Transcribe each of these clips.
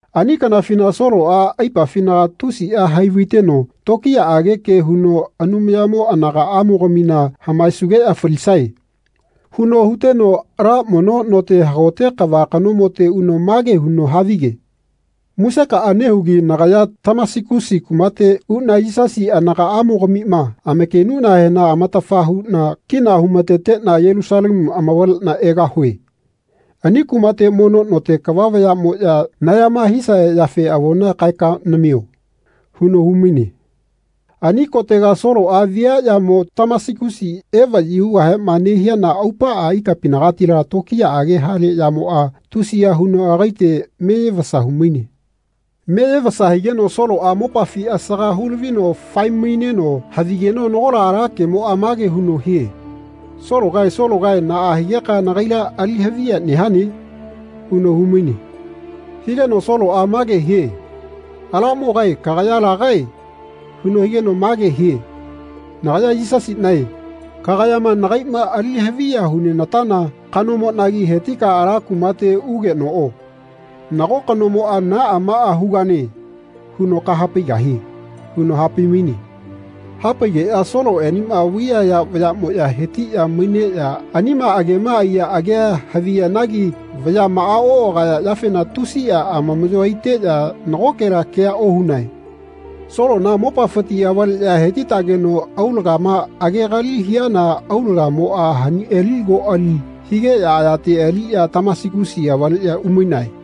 Ani kanafina Soloꞌa aipafinaga tusiꞌa hai-vaiteno tokiyaꞌage ke huno “Anumayamo anagaꞌamogamina hamaesugeꞌya falisae.” huno huteno ala mono note hagote kava kanomote uno mage huno havige “Musekaꞌa nehugi nagaya Tamasigusi kumate uꞌna Yisasi anagaꞌamogamima amakenuꞌnahena amatafa huꞌna kina humateteꞌna Yelusalemu amavaleꞌna egahue. Ani kumate mono note kava vayaꞌmoꞌya nayama hisaya yafe avona kaeka namio.” huno humaine. Ani kotega Soloꞌa viaꞌyamo Tamasigusi evaꞌyi hugahema nehiana aupaꞌa ikapinagatila tokiyaꞌage hale yamoꞌa tusiya huno agaite meyevasa humaine. Meyevasa higeno Soloꞌa mopafi asaga hulavino fae-maineno havigeno nagola ala kemoꞌa mage huno hie “Sologae Sologae naꞌa higeka nagaila ali haviya nehane?” huno humaine. Higeno Soloꞌa mage hie “Alamogae kagaya lagae?” huno higeno mage hie “Nagaya Yisasiꞌnae kagayama nagaiꞌma ali haviya hunenatana kanomoꞌnagi hetika ala kumate ugenoꞌo. Nago kanomoꞌa ‘Naꞌa maꞌa hugane.’ huno kahapaigahie.” huno hapai-maine. Hapaigeꞌya Soloꞌenema vaiyaya vayaꞌmoꞌya hetiꞌya maineꞌya anima agema aiya agea haviyanagi vayaꞌma oꞌagaya yafena tusiꞌa amamaꞌyo aiteꞌya nagokela kea ohunae. Solona mopafiti avaleꞌya hetitageno aulagama agegali hiana aulagamoꞌa haniꞌali koꞌali higeꞌya ayate aliꞌya Tamasigusi avaleꞌya umainae.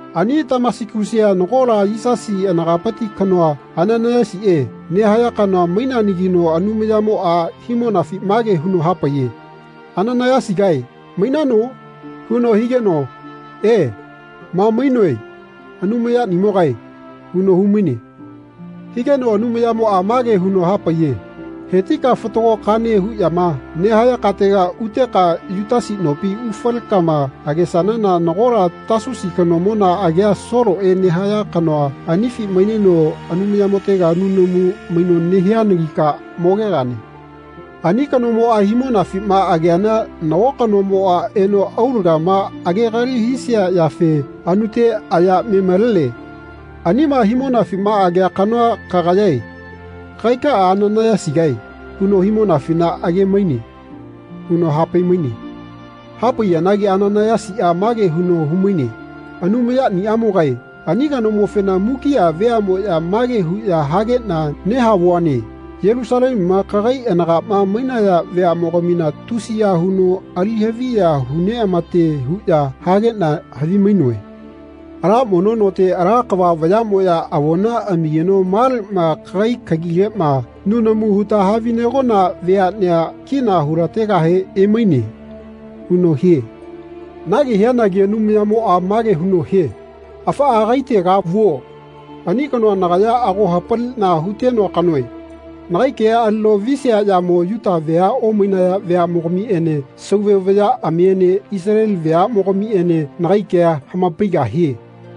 Ani Tamasigusia nagola Yisasi anagapiti kanoa, Ananaiyasiꞌe nehaya kanoa maineanagino Anumayamoꞌa himonafi mage huno hapaiye “Ananaiyasigae mainano?” huno higeno “E, ma mainoe Anumaya niꞌamogae.” huno humaine. Higeno Anumayamoꞌa mage huno hapaiye “Hetika fatago kane huꞌyama nehaya katega uteka Yutasi nopi ufalekama agesanana nagola Tasusi kanomona agia Soloꞌe nehaya kanoa anifi maineno Anumayamotega nunamu maino nehianagika mogegane. Ani kanomoꞌa himonafima ageana nago kanomoꞌa eno aulagama agegali hisia yafe anute aya me-malene. Anima himonafima agea kanoa kagayae. Kagaikaꞌa Ananaiyasigae huno himonafina age-maine.” huno hapai-maine. Hapaiyanagi Ananaiyasiꞌa mage huno humaine “Anumayaniꞌamogae ani kanomofena mukiꞌa veaꞌmoꞌya mage huꞌya hageꞌna nehavuane Yelusalemuma kagai anagaꞌma mainaya veaꞌmogamina tusiya huno ali haviya huneꞌamate huꞌya hageꞌna havi-mainoe. Ala mono note ala kava vayaꞌmoꞌya avona amigeno maleꞌma kagai kagileꞌma nunamu huta kahavinegona veaꞌnea kina hulategahe emaine.” huno hie. Nage hianagi Anumayamoꞌa mage huno hie “Afaꞌa agaitega vuo. Ani kanoa nagaya ago hapaliꞌna hutenoa kanoe. Nagai kea alino visiaꞌyamo Yuta vea omainaya veaꞌmogamiꞌene sauve vayaꞌamiene Isaleli veaꞌmogamiꞌene nagai kea hamapaigahie.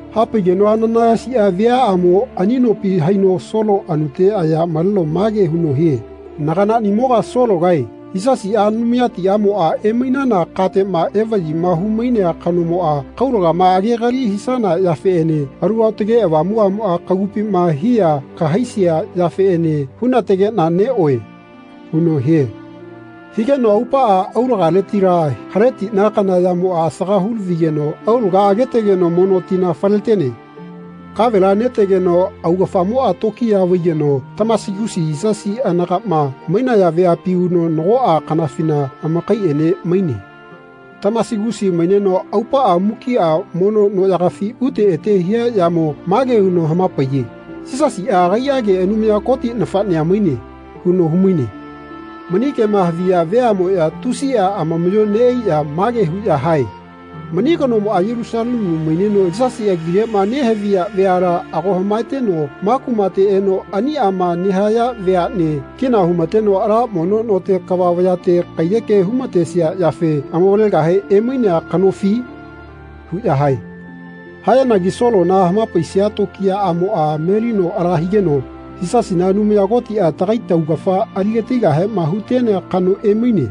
Hapaigeno Ananaiyasiꞌa viaꞌamo ani nopi haino Solo anute aya maleno mage huno hie “Naganaꞌnimoga Sologae Yisasiꞌa Anumayatiꞌamoꞌa emainana kateꞌma evaꞌyima hu-mainea kanomoꞌa kaulagama agegali hisana yafeꞌene Alu Aotage Avamuꞌmoꞌa kagupima hiya kahaisia yafeꞌene hunategeꞌna neꞌoe.” huno hie. Higeno aupaꞌa aulagaletila haletiꞌna kana yamoꞌa asaga hulavigeno aulaga agetegeno mono tina faletene. Kavela netegeno augafamoꞌa tokiya vaigeno Tamasigusi Yisasi anagaꞌma mainaya veapi uno nagoꞌa kanafina amakaiꞌene maine. Tamasigusi maineno aupaꞌa mukiꞌa mono noꞌyagafi ute ete hia yamo mage huno hamapaiye “Yisasiꞌa agaiꞌage Anumaya Koti nafaꞌnea maine.” huno humaine. Mani kema haviya veaꞌmoꞌya tusiꞌa amamaꞌyo neꞌaiꞌya mage huꞌya hae “Mani kanomoꞌa Yelusalemu maineno Yisasi agileꞌma nehaviya veala ago hamaeteno ma kumate eno aniꞌama nehaya veaꞌne kina humateno ala mono note kava vayate kaiyeke humatesia yafe amavalegahe emainea kanofi?” huꞌya hae. Hayanagi Solona hamapaisia tokiyaꞌamoꞌa melino ala higeno “Yisasina Anumaya Kotiꞌa tagai taugafa aligatigahema hutenea kano emaine.”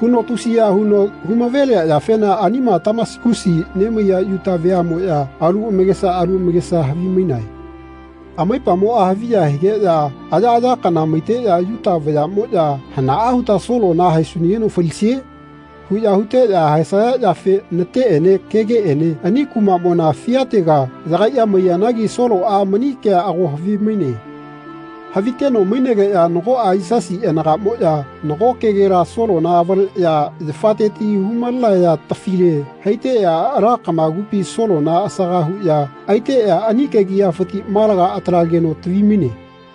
huno tusiya huno humavelia yafena anima Tamasagusi nemaiya Yuta veaꞌmoꞌya alu amakesa alu amakesa havimainae. Amaipamoꞌa haviya higeꞌya ayaꞌaya kana maiteꞌya Yuta vayaꞌmoꞌya “Hanaꞌa huta Solona haesunageno falisie?” huꞌya huteꞌya haesaya yafe nateꞌene kegeꞌene ani kumaꞌmona fiatega yagaiꞌya maiyanagi Soloꞌa mani kea ago havimaine. Haviteno mainegeꞌya nagoꞌa Yisasi anagaꞌmoꞌya nago kegela Solona avaleꞌya yafateti humalenaya tafile haiteꞌya ala kamagupi Solona asaga huꞌya aiteꞌya ani kegiꞌyafiti malaga atalageno tavimaine.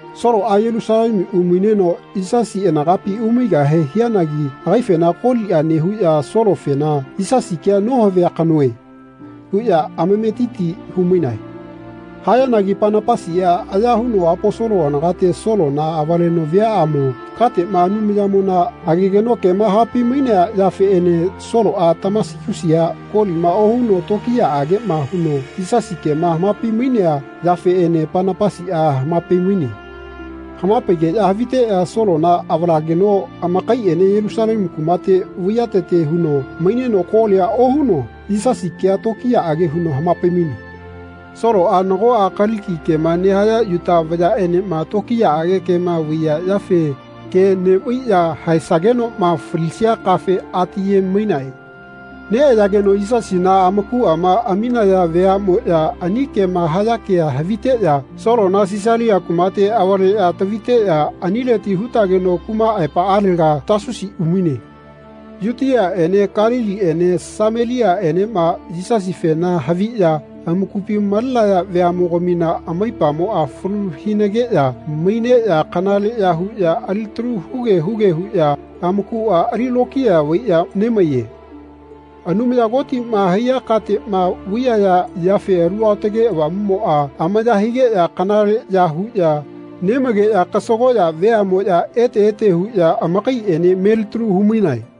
Soloꞌa Yelusalemu umaineno Yisasi anagapi umaigahe hianagi agaifena koliꞌa nehuꞌya Solofena “Yisasi kea nohavia kanoe.” huꞌya amametiti humainae. Hayanagi Panapasiꞌa aya huno Aposolo anagate Solona avaleno viaꞌamo kategama Anumayamona agegeno kema hapai-mainea yafeꞌene Soloꞌa Tamasigusia kolima ohuno tokiyaꞌageꞌma huno Yisasi kema hamapai-mainea yafeꞌene Panapasiꞌa hamapai-maine. Hamapaigeꞌya haviteꞌya Solona avalageno amakaiꞌene Yelusalemu kumate vaiyatete huno maineno kolia ohuno Yisasi kea tokiyaꞌage huno hamapai-maine. Soloꞌa nagoꞌa Kaliki kema nehaya Yuta vayaꞌenema tokiyaꞌage kema vaiya yafe ke neꞌvaiꞌya haesagenoꞌma falisia kafe atiye-mainae. Neꞌayageno Yisasina amakuꞌama aminaya veaꞌmoꞌya ani kema haya kea haviteꞌya Solona Sisalia kumate avaleꞌya taviteꞌya anileti hutageno kuma aepaꞌalega Tasusi umaine. Yutiaꞌene Kaliliene Sameliaꞌenema Yisasifena haviꞌya amakupi malenaya veaꞌmogamina amaipamoꞌa falu hinageꞌya maineꞌya kanaleꞌya huꞌya alitalu huge huge huꞌya amakuꞌa ali lokiya vaiꞌya nemaiye. Anumaya Kotima haiya kateꞌma vaiyaya yafe Alu Aotage Avamuꞌmoꞌa amaya higeꞌya kanaleꞌya huꞌya nemaigeꞌya kasagoꞌya veaꞌmoꞌya ete ete huꞌya amakaiꞌene melitalu humainae.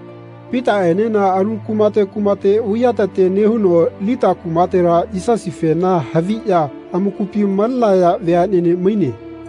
Pitaꞌenena alu kumate kumate vaiyatete nehuno Lita kumatela Yisasifena haviꞌya amakupi malenaya veaꞌnene maine.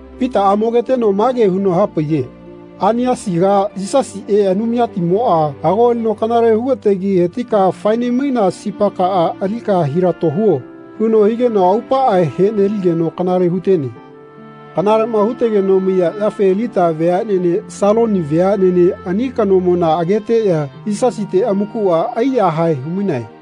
Pitaꞌa mogeteno mage huno hapaiye “Ainiasiga Yisasiꞌe, Anumayatimoꞌa, ago alino kanale hugategi hetika fae-nemaina sipakaꞌa alika hilato huo.” huno higeno aupaꞌa heꞌneligeno kanale hutene. Kanaleꞌma hutegeno maiya yafe Lita veaꞌnene Saloni veaꞌnene ani kanomona ageteꞌya Yisasite amakuꞌa aiyahae humainae.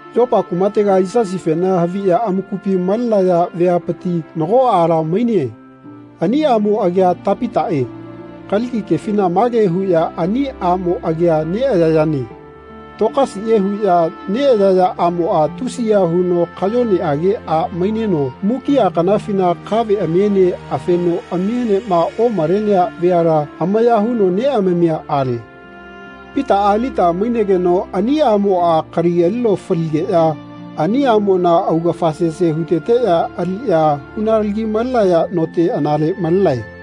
Yopa kumatega Yisasifena haviꞌya amakupi malenaya veapiti nago aala maine. Ani aꞌmo agia Tapitaꞌe. Kaliki kefina mage huꞌya ani aꞌmo agia neꞌayayane Tokasiꞌe huꞌya neꞌayaya aꞌmoꞌa tusiya huno kayoneꞌage a maineno mukiꞌa kanafina kaveꞌamiene afenoꞌamienema omalenea veala amaya huno neꞌamamia ale. Pitaꞌa Lita mainegeno ani aꞌmoꞌa kali alino faligeꞌya ani aꞌmona augafa sese huteteꞌya aliꞌya hunalagi-malenaya note anale malenae.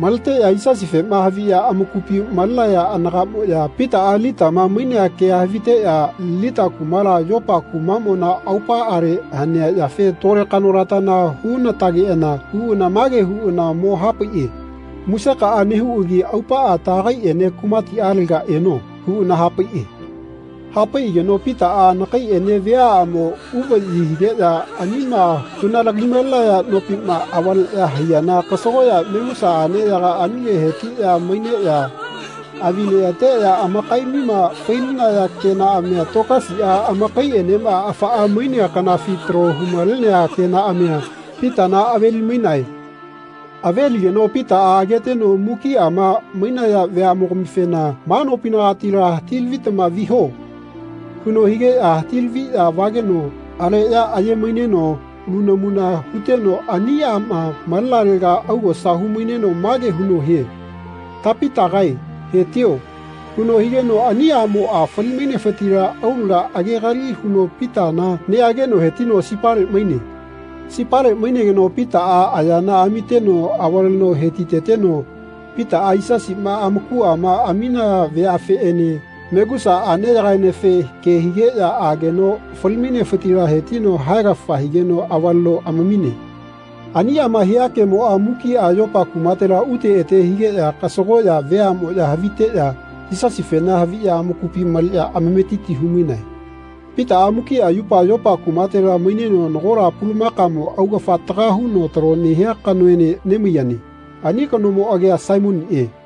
Maleteꞌya Yisasifema haviꞌya amakupi malenaya anagaꞌmoꞌya Pitaꞌa Litama mainea kea haviteꞌya Lita kumala Yopa kumaꞌmona aupaꞌale hanea yafe tole kanolatana hunatageꞌana uꞌana mage huꞌana mo-hapaiꞌe “Musekaꞌa nehuꞌagi aupaꞌa taꞌagaiꞌene kumatiꞌalega eno.” huꞌana hapaiꞌe. Hapaiꞌageno Pitaꞌa anakaiꞌene viaꞌamo uvaꞌyi higeꞌya anima hunalagi-malenaya nopima avaleꞌya haiyana kasagoꞌya megusa aꞌneyaga anile hetiꞌya maineꞌya avi neꞌateꞌya amakaiꞌamima fai-linaya kenaꞌamia Tokasiꞌa amakaiꞌenema afaꞌa mainea kanafi talo humalenea kenaꞌamia Pitana aveli-mainae. Aveligeno Pitaꞌa ageteno mukiꞌama mainaya veaꞌmogamifena “Ma nopinagatila hati-lavitama viho.” huno higeꞌya hati-laviꞌya vageno aleꞌya aye-maineno nunamuna huteno ani aꞌma malenalega augosa humaineno mage huno hie “Tapitagae hetio.” huno higeno ani aꞌmoꞌa fali-mainefitila aulaga agegali huno Pitana neꞌageno hetino sipale maine. Sipale mainegeno Pitaꞌa ayana amiteno avale hetiteteno Pitaꞌa Yisasima amakuꞌama aminaya veafeꞌene megusa aꞌneyagaenefe ke higeꞌya aageno fali-mainefitila hetino haegafa higeno avaleno amamine. Aniꞌama hia kemoꞌa mukiꞌa Yopa kumatela ute ete higeꞌya kasagoꞌya veaꞌmoꞌya haviteꞌya Yisasifena haviꞌya amakupi maleꞌya amametiti humainae. Pitaꞌa mukiꞌa yupa Yopa kumatela maineno nagola pulamakamo augafa taga huno talo nehia kanoene nemaiyane. Ani kanomo agia Saimoniꞌe.